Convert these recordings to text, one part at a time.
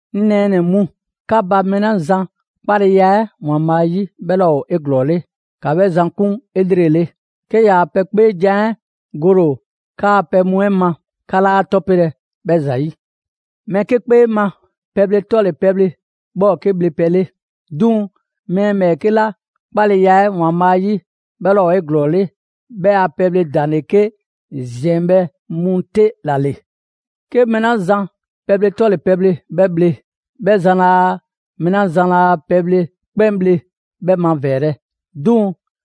'Ŋ nɛɛnɛ‑ mu, 'ka ba mɛɛ 'la zan 'kpaleya 'ɛ ‑Waanbhaa' 'yi 'bhɛ 'laa ‑o 'eglɔɔle, ‑ka 'bhɛ zan 'kun 'elrele. 'Ke ‑yaa' pɛ 'kpeejan‑ 'ɛ gole ‑o 'kaa‑ pɛ mu 'ɛ ma, 'ka 'laa 'a 'tɔpelɛ 'bhɛ ‑zayi'. Mɛɛ 'ke 'kpee ma, pɛbhle 'tɔle‑ pɛbhle, 'bhɛ ‑o 'ke bhlepɛ 'le. 'Duŋ‑ mɛɛ ‑bhɛɛke' 'la 'kpaleya 'ɛ ‑Waanbhaa' 'yi, 'bhɛ 'laa ‑o 'eglɔɔle, 'bhɛ a pɛbhle ‑daŋ' ‑le 'ke ‑ziɛnbhɛ' mu 'te ‑la ‑le. 'Ke mɛɛ 'la zan pɛbhle 'tɔle‑ pɛbhle 'bhɛ bhle, 'bhɛ zan laa mɛɛ 'la zan laa pɛbhle 'kpɛn bhle 'bhɛ mavɛɛlɛ; 'duŋ‑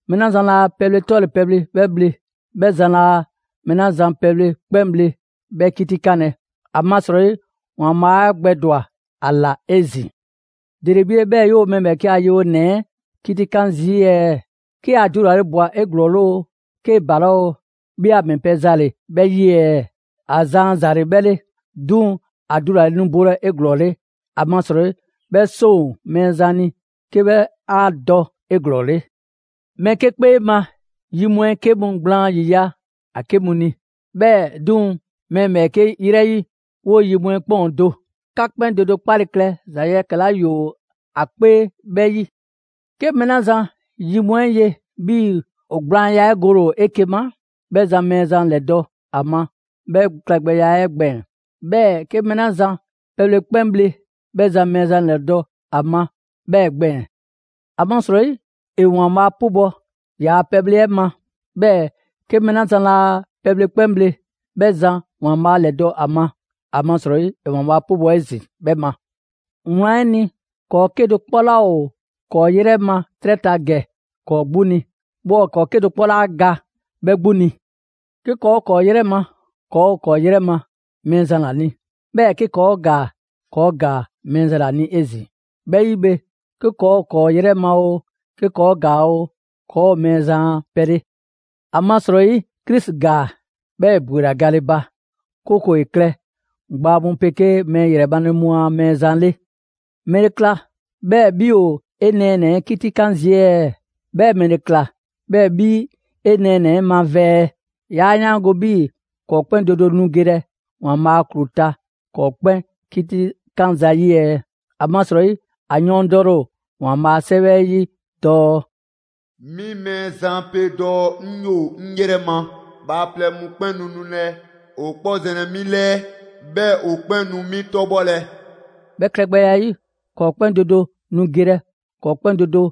mɛɛ 'la zan laa pɛbhle 'tɔle‑ pɛbhle 'bhɛ bhle, 'bhɛ zan laa mɛɛ 'la zan pɛbhle 'kpɛn bhle 'bhɛ 'kitikanlɛ. ‑Amasrɔyi ‑Waanbhaa' 'e gbɛdwa‑ ‑a ꞊la 'ezin‑. ‑Dele 'bhi 'le 'bhɛɛ‑ 'yoo‑ mɛɛ ‑bhɛɛke' a yewonɛ 'ɛ 'kitikan zii' ɛɛ? 'Ke ‑a dulale ꞊bwa 'eglɔɔle oo, 'kee‑ ‑balaa' oo, 'bhi a ‑mɛ pɛ za ‑le 'bhɛ 'yi ɛɛ? ‑A zan a ‑za ‑le 'bhɛ 'le. 'Duŋ‑ ‑a dulale nu bolɛ 'eglɔɔle, ‑amasrɔyi 'bhɛ 'seŋ ‑o Mɛɛzan ni 'ke 'bhɛ 'a dɔ 'eglɔɔle. Mɛɛ 'ke 'kpee ma, yi mu 'ɛ 'ke mu gblaan ‑yiya' ‑a 'ke mu ni, 'bhɛɛ‑ 'duŋ‑ mɛɛ ‑bhɛɛke' ‑yrɛ 'yi, 'woo‑ yi mu 'ɛ 'kpɛn ‑o do. 'Ka 'kpɛn do do 'kpale‑ klɛ ‑za yɛkɛ‑ 'la ‑yoo 'a 'kpee 'bhɛɛ‑ 'yi. 'Ke mɛɛ 'la zan yi mu 'ɛ ye 'bhii‑ ‑o gblaanya 'ɛ gole 'eke‑ ma, 'bhɛ zan Mɛɛzan ‑lɛdɔ' ‑a ma 'bhɛ klɛgbɛya 'ɛ gbɛɛn‑. 'Bhɛɛ‑ 'ke mɛɛ 'la zan pɛbhle 'kpɛn bhle, 'bhɛ zan Mɛɛzan ‑lɛdɔ' ‑a ma 'bhɛɛ‑ gbɛɛn‑; ‑amasrɔyi ‑e ‑Waanbhaa' 'pubɔ‑ ‑yaa' pɛbhle 'ɛ ma. 'Bhɛɛ‑ 'ke mɛɛ 'la zan laa pɛbhle 'kpɛn bhle, 'bhɛ zan Mɛɛzan ‑lɛdɔ' ‑a ma; ‑amasrɔyi ‑e ‑Waanbhaa' 'pubɔ‑ 'ezin‑ 'bhɛ ma. Wlan 'ɛ ni, ‑kɔɔ' 'kedo‑ 'kpɔ 'laa ‑o ‑kɔɔ' 'yrɛ ma 'trɛ ta ‑gɛ ‑kɔɔ' 'gbu ni, 'bhɛɛ ‑kɔɔ' 'kedo‑ 'kpɔ 'laa ga 'bhɛ 'gbu ni. 'Ke ‑kɔɔ' ‑o ‑kɔɔ' 'yrɛ ma, ‑kɔɔ' ‑o ‑kɔɔ' 'yrɛ ma Mɛɛzan ‑la ni; 'bhɛɛ‑ 'ke ‑kɔɔ' ‑gaa, ‑kɔɔ' ‑gaa Mɛɛzan ‑la ni 'ezin‑. 'Bhɛ 'yi bhe, 'ke ‑kɔɔ' ‑o ‑kɔɔ' 'yrɛ ma oo, 'ke ‑kɔɔ' ‑gaa oo, ‑kɔɔ ‑o Mɛɛzan ‑a pɛ 'le. ‑Amasrɔyi Krisi ‑gaa, 'bhɛɛ‑ ‑e ‑bwela gale ba, 'kooko‑ ‑e klɛ gbaa mu 'pegee mɛɛ ‑yrɛ male mu a Mɛɛzan 'le. ‑Mɛle ‑kla 'bhɛɛ‑ 'bhi ‑o 'e nɛɛnɛ‑ 'ɛ 'kitikan zii' ɛɛ? 'Bhɛɛ‑ ‑mɛle ‑kla 'bhɛɛ‑ 'bhi 'e nɛɛnɛ‑ 'ɛ mavɛɛ‑? 'Yaa 'yaango‑ 'bhii‑ ‑kɔɔ' 'kpɛn do do nu gelɛ ‑Waanbhaa' a ‑klu ta ‑kɔɔ' 'kpɛn 'kitikan zayi' ɛɛ? ‑Amasrɔyi ‑a yɔɔndɛle ‑o ‑Waanbhaa' a 'Sɛwɛ 'ɛ 'yi dɔɔ: «'Mi Mɛɛzan pe dɔɔ: 'Ŋ 'yoo‑ 'ŋ 'yrɛ ma, bhaaplɛŋ mu 'kpɛn nu nulɛ ‑o 'kpɔ zɛnlɛ 'mi 'lɛɛ, 'bhɛɛ‑ ‑o 'kpɛn nu 'mi 'tɔbhɔlɛ.» 'Bhɛ klɛgbɛya 'ɛ 'yi, ‑kɔɔ' 'kpɛn do do nu gelɛ ‑kɔɔ' 'kpɛn do do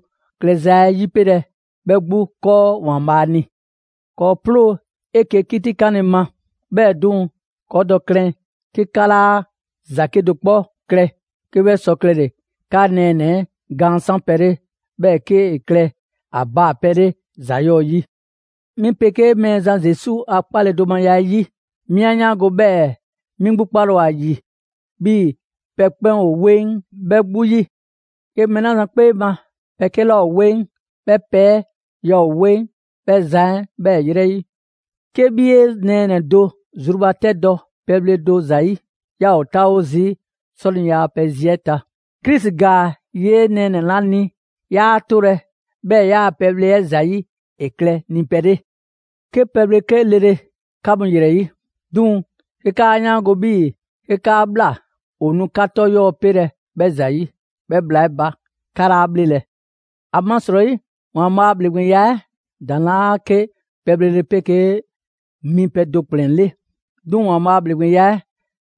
klɛza 'ɛ 'yipelɛ 'bhɛ 'gbu 'kɔɔ ‑Waanbhaa' ni. ‑Kɔɔ' 'ploo‑ 'eke‑ 'kitikanle ma. 'Bhɛɛ‑ 'duŋ‑ ‑ka dɔ klɛn 'ke 'ka 'laa ‑za 'kedo‑ 'kpɔ klɛ 'ke 'bhɛ sɔ klɛle‑ 'ka nɛɛnɛ‑ 'ɛ gaan 'sanpɛ‑ 'le, 'bhɛɛ‑ 'kee‑ klɛ ‑a baa‑ pɛ 'le ‑za 'yɔɔ‑ 'yi. 'Mi 'pegee Mɛɛzan Zesu a 'kpaledomaya 'ɛ 'yi, 'mi 'a 'yaango‑ 'bhɛɛ‑ 'mi 'gbu 'kpale‑ ‑o ‑a ‑yi 'bhii‑ pɛ 'kpɛn ‑o 'weŋ 'bhɛ 'gbu 'yi. 'Ke mɛɛ 'la zan 'kpee ma, pɛ 'ke 'laa ‑o 'weŋ, 'bhɛ pɛ 'ɛ yaa ‑o 'weŋ 'bhɛ zan 'ɛ 'bhɛɛ‑ ‑yrɛ 'yi. 'Ke 'bhi 'e nɛɛnɛ‑ do zrubatɛdɔ pɛbhle do ‑zayi', 'yaa ‑o 'taawo zii' 'sɔniya a pɛ zi 'ɛ ta. Krisi ‑gaa 'yee‑ 'e nɛɛnɛ‑ 'la ni, 'yaa 'tolɛ‑ 'bhɛɛ‑ 'yaa‑ pɛbhle 'ɛ ‑zayi' ‑e klɛ ni pɛ 'le. 'Ke pɛbhle 'ke lele 'ka mu ‑yrɛ 'yi; 'duŋ‑ 'ke 'kaa 'yaango‑ 'bhii‑ 'ke 'kaa ꞊bhla, ‑o nu 'ka 'tɔ 'yɔɔ‑ pelɛ 'bhɛ ‑zayi', 'bhɛ bhla 'ɛ ba, 'ka 'laa 'bhlelɛ‑. ‑Amasrɔyi ‑Waanbhaa' a ‑bhleŋgbeya 'ɛ ‑daŋ' 'laa 'ke pɛbhle 'pegee mipɛ do ‑kplɛn 'le. 'Duŋ‑ ‑Waanbhaa' a ‑bhleŋgbeya 'ɛ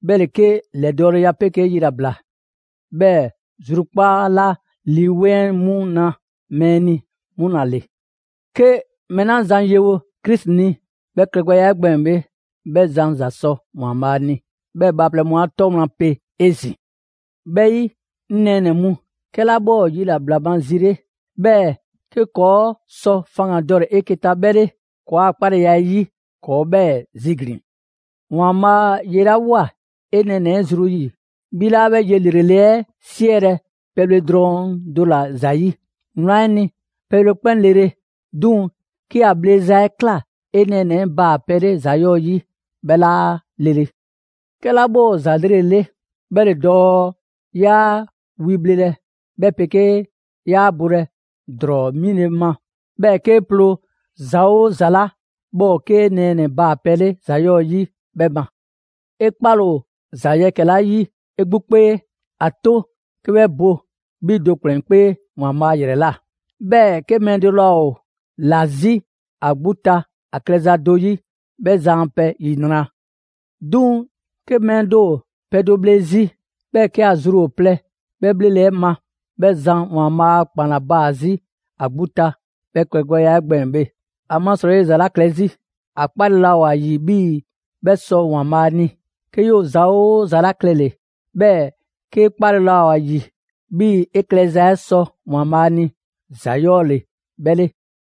'bhɛ ‑le 'ke ‑lɛdɔɔleya 'pegee yilabla, 'bhɛɛ‑ zrukpaa' 'la Lii 'Weŋ 'ɛ 'mu na mɛɛ ni, 'mu ‑la ‑le. 'Ke mɛɛ 'la zan yewo Krisi ni 'bhɛ klɛgbɛya 'ɛ gbɛɛn‑ bhe, 'bhɛ zan ‑za sɔ ‑Waanbhaa' ni, 'bhɛɛ‑ bhaaplɛŋ mu 'a 'tɔ wlan pe 'ezin‑. 'Bhɛ 'yi, 'ŋ nɛɛnɛ‑ mu, 'kɛla 'bhɛ ‑o yilabla ma zi 'le, 'bhɛɛ‑ 'ke ‑kɔɔ' sɔ faŋgandɔle 'eke‑ ta 'bhɛ 'le ‑kɔɔa' 'kpaleya 'ɛ 'yi, ‑kɔɔ' 'bhɛɛ‑ ziglin‑. ‑Waanbhaa' yelawoa 'e nɛɛnɛ‑ 'ɛ zru 'yi, 'bhi 'laa 'bhɛ ye ‑lrele' 'ɛ 'siɛlɛ‑ pɛbhle drɔŋ do ‑la ‑zayi'. Wlan 'ɛ ni, pɛbhle 'kpɛn lele; 'duŋ‑ 'ke a bhleza 'ɛ ꞊kla 'e nɛɛnɛ‑ baa‑ pɛ 'le ‑za 'yɔɔ‑ 'yi, 'bhɛ 'laa lele. 'Kɛla 'bhɛ ‑o ‑za 'lrele‑ 'le, 'bhɛ ‑le dɔɔ 'yaa wi bhlelɛ 'bhɛ 'pegee 'yaa bolɛ ‑drɔɔ 'mile‑ ma, 'bhɛɛ‑ 'kee ploo ‑za 'oo ‑za 'la 'bhɛ ‑o 'ke 'e nɛɛnɛ‑ baa‑ pɛ 'le ‑za 'yɔɔ‑ 'yi, 'bhɛ ma. 'E 'kpale‑ ‑o ‑za yɛkɛ‑ 'la 'yi 'e 'gbu 'kpee, ‑a 'to 'ke 'bhɛ bo 'bhi do ‑kplɛn 'kpee ‑Waanbhaa' ‑yrɛ ꞊la. 'Bhɛɛ‑ 'ke mɛɛ do laa ‑o ‑la 'zi ‑a 'gbu ta ‑a klɛza do 'yi, 'bhɛ zan a pɛ ‑yinra'! 'Duŋ‑ 'ke mɛɛ do ‑o pɛ do bhle 'zi, 'bhɛɛ‑ 'ke ‑a zru ‑o plɛ 'bhɛ pɛbhle 'ɛ ma, 'bhɛ zan ‑Waanbhaa' a ‑kpan ‑la baa‑ 'zi ‑a 'gbu ta 'bhɛ klɛgbɛya 'ɛ gbɛɛn‑ bhe. ‑Amasrɔyi ‑e ‑za 'la klɛ 'zi, ‑a 'kpale‑ laa ‑o ‑a ‑yi 'bhii‑ 'bhɛ sɔ ‑Waanbhaa' ni. 'Ke 'yoo‑ ‑za 'oo ‑za la klɛle‑, 'bhɛɛ‑ 'kee 'kpale‑ laa ‑o ‑a ‑yi 'bhii‑ 'e klɛza 'ɛ sɔ ‑Waanbhaa' ni, ‑za 'yɔɔ‑ ‑le 'bhɛ 'le.